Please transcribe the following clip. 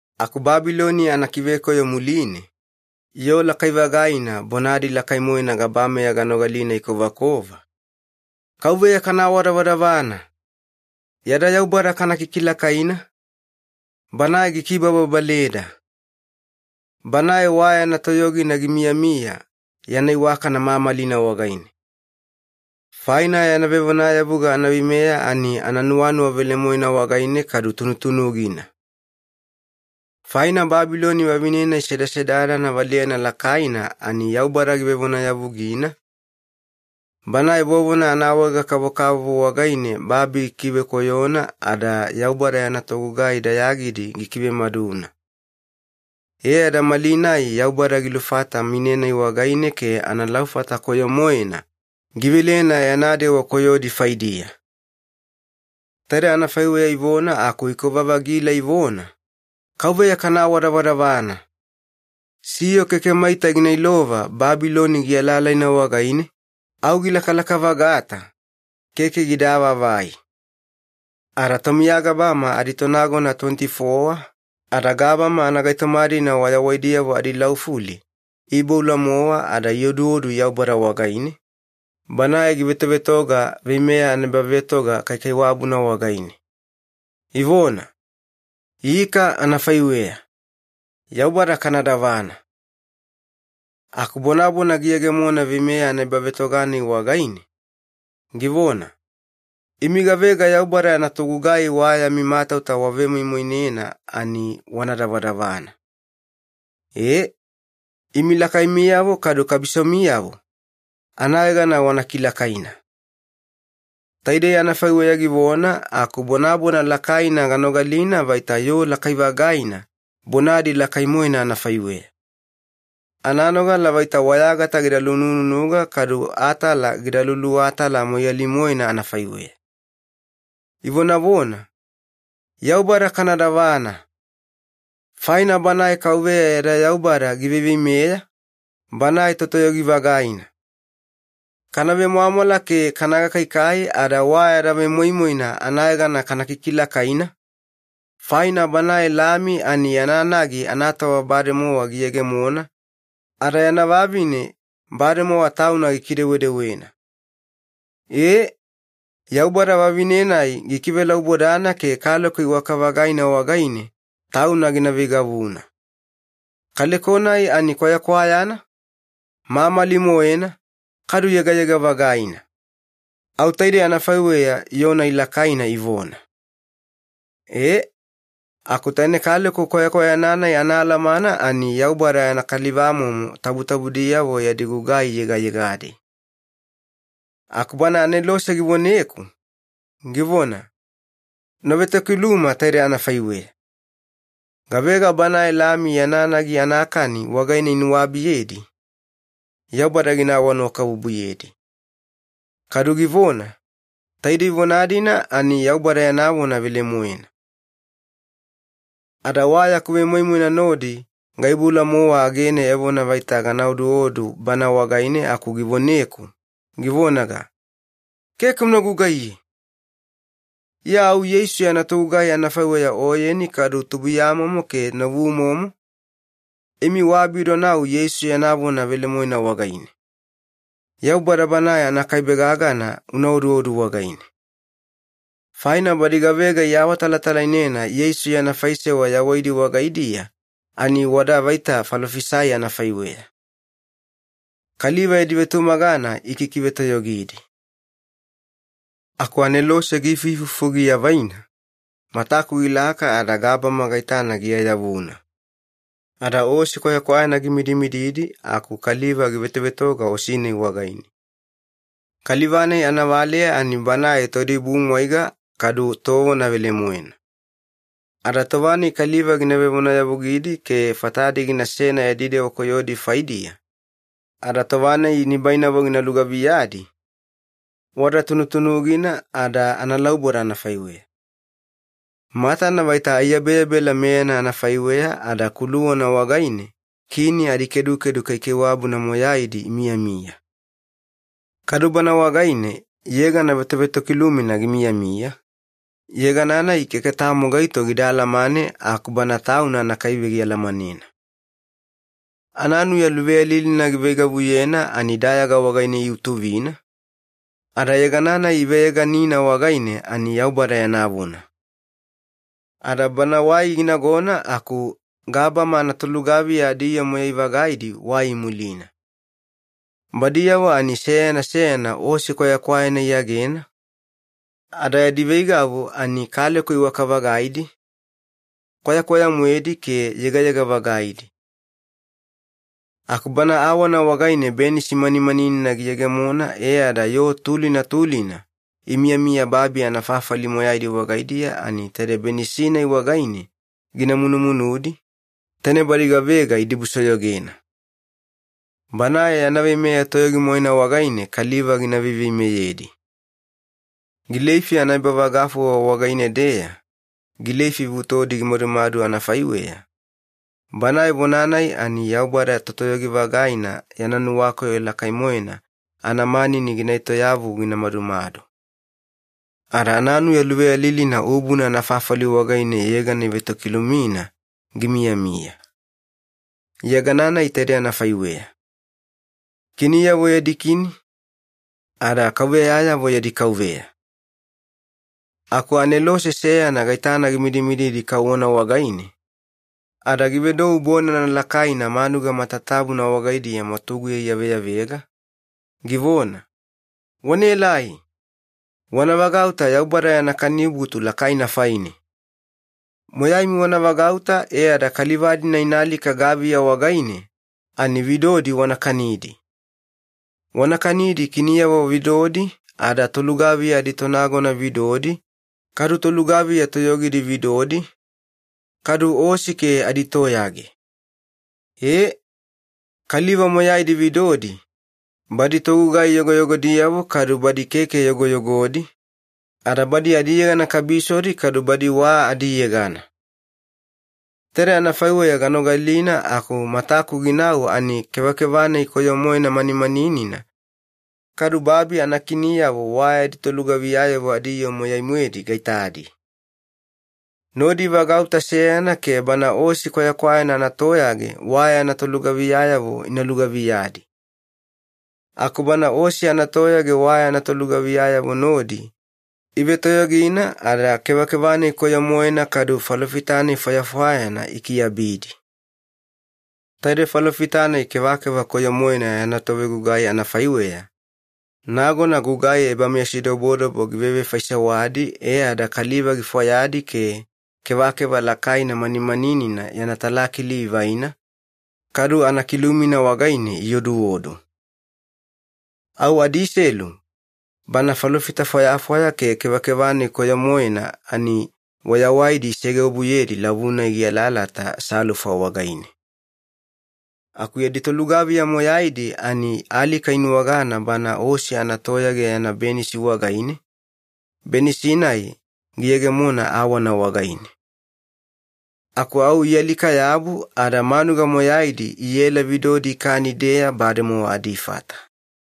Aku Babiloni anakivekoyo muline, yoo lakai-vagaina bonadi lakai-moena gabameya ganogalina ikovakova, “KAUVEYA kana awadavadavana! Yada Yaubada kana kikilakaina, Banae gikibababaleda! Banae wa yana toyogina gimiyamiya yana iwakana mamalina wagaine. Faina yana vevonayavuga anaveimeya ani nuwanuwa velemoena wagaine kadu tunutunugina. Faina Babiloni vavine-nai sedasedadana valeyana lakaina ani Yaubada givevonayavugina, banae vovona anaawaega-kavokavovo wagaine babi gikivekoyona, ada Yaubada yana togugai dayagidi gikivemaduna. E ada malinai Yaubada gilufata mine-nai wagaine ke analaufata koyo-moena givelena yana dewa koyodi faidiya.” Taide anafaiweya ivona aku ikova-vagila ivona, “KAUVEYA kana awadavadavana! Siyo keke maita gina ilova Babiloni gialaalaina wagaine, au gilakalaka-vagata, keke gida avaavai.” Ada tomiya gabama aditonagona tuweniti-fowa ada gabama anagaitoma-dina wayawaidiyavo adilaufuli iiboula-mowa ada ioduodu Yaubada wagaine, Banae givetovetoga veimeya anaebavetoga kaikaiwabuna wagaine. Ivona, “Ika anafaiweya! Yaubada kana davana!” Aku bonabona giyegemona veimeya anaebavetoga-nai wagaine, givona, “Imi gavega Yaubada yana togugai wa yami matauta wavemoimoinena ani wana davadavana. E, imi lakaimiyavo kadu kabisomiyavo, anayegana wana kilakaina.” Taidei anafaiweya givona aku bonabona lakaina ganogalina vaita yoo lakai-vagaina bonadi lakai-moena anafaiweya. Ananogala vaita wayagata gida lunununuga kadu atala gida luluwatala moiyali-moena anafaiweya. Ivonavona, “Yaubada kana davana! Faina Banae KAUVEYA yada Yaubada giveiveimeya, Banae Totoyogi-vagaina. Kana vemwamwala ke kana gakaikai ada wa yada vemoimoina anayegana kana kikilakaina, faina Banae Lami ani yana nagi anatova bademowa giyegemona, ada yana vavine bademowa tauna gikidewedewena. Ee, Yaubada vavine-nai gikivelaubodana ke kaleko iwaka-vagaina wagaine tauna gina veigavuna. Kaleko-nai ani kwayakwayana, mamali-moena, kadu yegayega-vagaina.” Au taide anafaiweya yoo-nai lakaina ivona. Ee, aku taine kaleko kwayakwayana-nai anaalamana ani Yaubada yana kalivamomo tabutabudiyavo yadi gugai yegayegadi. Aku bana anelose givoneku, givona, “Una vetokiluma taidei anafaiweya. ‘Gavega Banae Lami yana nagi anakani wagaine inuwabiyedi, Yaubada gina awanuwakabubuyedi.’ Kadu givona, ‘Taidei vona-dina ani Yaubada yana vona velemoena.’” Ada wa yaku vemoimoina nodi gaiboula-mowa agene evona vaita gana oduodu bana wagaine aku givoneku, givonaga, “Keke una gugaiye! Iya au Yeisu yana togugai anafaiweya oyeni kadu tubuiyamomo ke novumomo, imi waabidonau Yeisu yana vona velemoena wagaine. Yaubada Banae anakaibe-gagana una oduodu wagaine.” Faina badi gavega iawatalatalainena Yeisu yana faisewa yawaidi wagaidiya ani wada vaita falofisai anafaiweya. Kaliva yadi vetumagana ikikivetoyogidi. Aku anelose giifuifufu giavaina, mataku gilaka ada gabama gaitana giayavuna. Ada osi kwayakwayana gimidimididi aku kaliva givetovetoga osi-nai wagaine. Kaliva-nai anavaleya ani Banae Toidibumwaiga kadu Tovona Velemoena. Ada tova-nai kaliva gina vevonayavugidi ke fatadi ginasena yadi dewa koyodi faidiya, ada tova-nai nibainavo gina lugaviyadi, wada tunutunugina ada analauboda anafaiweya. Matana vaita aiyabeyabela meyana anafaiweya ada kuluwana wagaine kini adikedukedu kaikaiwabuna moyaidi imiyamiya. Kadu Bana wagaine yegana vetovetokilumina gimiyamiya, yegana-nai keke tamo gaito gida alamane aku Bana Tauna anakaibe gialamanena. Ananuya luveyalilina giveigavuyena ani dayaga wagaine iutuvina, ada yegana-nai iveyeganina wagaine ani ‘Yaubada yana Vona’. Ada Bana wai ginagona, aku gabama anatolugaviya adiyoo moyai-vagaidi wai imulina. Badiyavo ani seyana seyana osi kwayakwayana iyagena, ada yadi veigavu ani kaleko iwaka-vagaidi, kwayakwaya-moedi ke yegayega-vagaidi. Aku Bana awana wagaine benisi manimaninina giyegemona, e ada yoo tulina tulina imiyamiya babi anafafali moyaidi wagaidiya ani taide benisi-nai wagaine gina munumunudi, taine badi gavega idibusoyogena. Banae yana veimeya toyogi-moena wagaine kaliva gina veiveimeyedi. Gileifi anaebavagafuwa wagaine-deya gileifi vutodi gimadumadu anafaiweya, Banae Vona-nai ani Yaubada Totoyogi-vagaina yana nuwakoyo lakai-moena anamanini gina etoyavu gina madumadu. Ada ananuya luveyalilina ubuna anafafali wagaine yegana ivetokilumina gimiyamiya. Yegana-nai taidei anafaiweya. KINIYAVO YADI KINI ADA KAUVEYAYAVO YADI KAUVEYA Aku anelose seyana gaitana gimidimididi kauwana wagaine, ada givedou bonana lakaina manuga matatabuna wagaidiya mwatuguya iyaveyavega, givona, “Wanaelai! Wana vagauta Yaubada yana kanibutu lakaina faine! Moyaimi wana vagauta e ada kaliva-dina ina alika gaviya wagaine, ani vidodi wana kanidi. Wana kanidi kiniyavo vidodi, ada tolugaviya aditonagona vidodi, kadu tolugaviya toyogidi vidodi, kadu osi ke aditoyage. Ee, kaliva moyaidi vidodi, badi togugai yogoyogodiyavo kadu badi keke yogoyogodi, ada badi adiyegana kabisodi kadu badi wa adiyegana.” Taide anafaiweya ganogalina aku mataku ginau ani kevakeva-nai koyo-moena manimaninina, kadu babi anakiniyavo wa yadi tolugaviyayavo adiyoo moyai-moedi gaitadi. Nodi ivagauta seyana ke Bana osi kwayakwayana anatoyage wa yana tolugaviyayavo ina lugaviyadi. Aku Bana osi anatoyage wa yana tolugaviyayavo nodi ivetoyogina ada kevakeva-nai koyo-moena kadu falofita-nai fwayafwayana ikiabidi. Taide falofita-nai kevakeva koyo-moena yana tovegugai anafaiweya, nagona gugai ebameyasidobodobo givevefaisewadi e ada kaliva gifwayadi ke kevakeva lakaina manimaninina yana talakili ivaina, kadu anakilumina wagaine ioduodu. Au adiselu, bana falofita fwayafwaya ke kevakeva-nai koyo-moena ani wayawaidi isegeobuyedi lavu-nai gialaalata salufa wagaine. Aku yadi tolugaviya moyaidi ani alika inuwagana Bana osi anatoyage yana benisi wagaine, benisi-nai giyegemona awana wagaine. Aku au ialika-yabu, ada manuga moyaidi iela vidodi ikani-deeya bademowa adifata.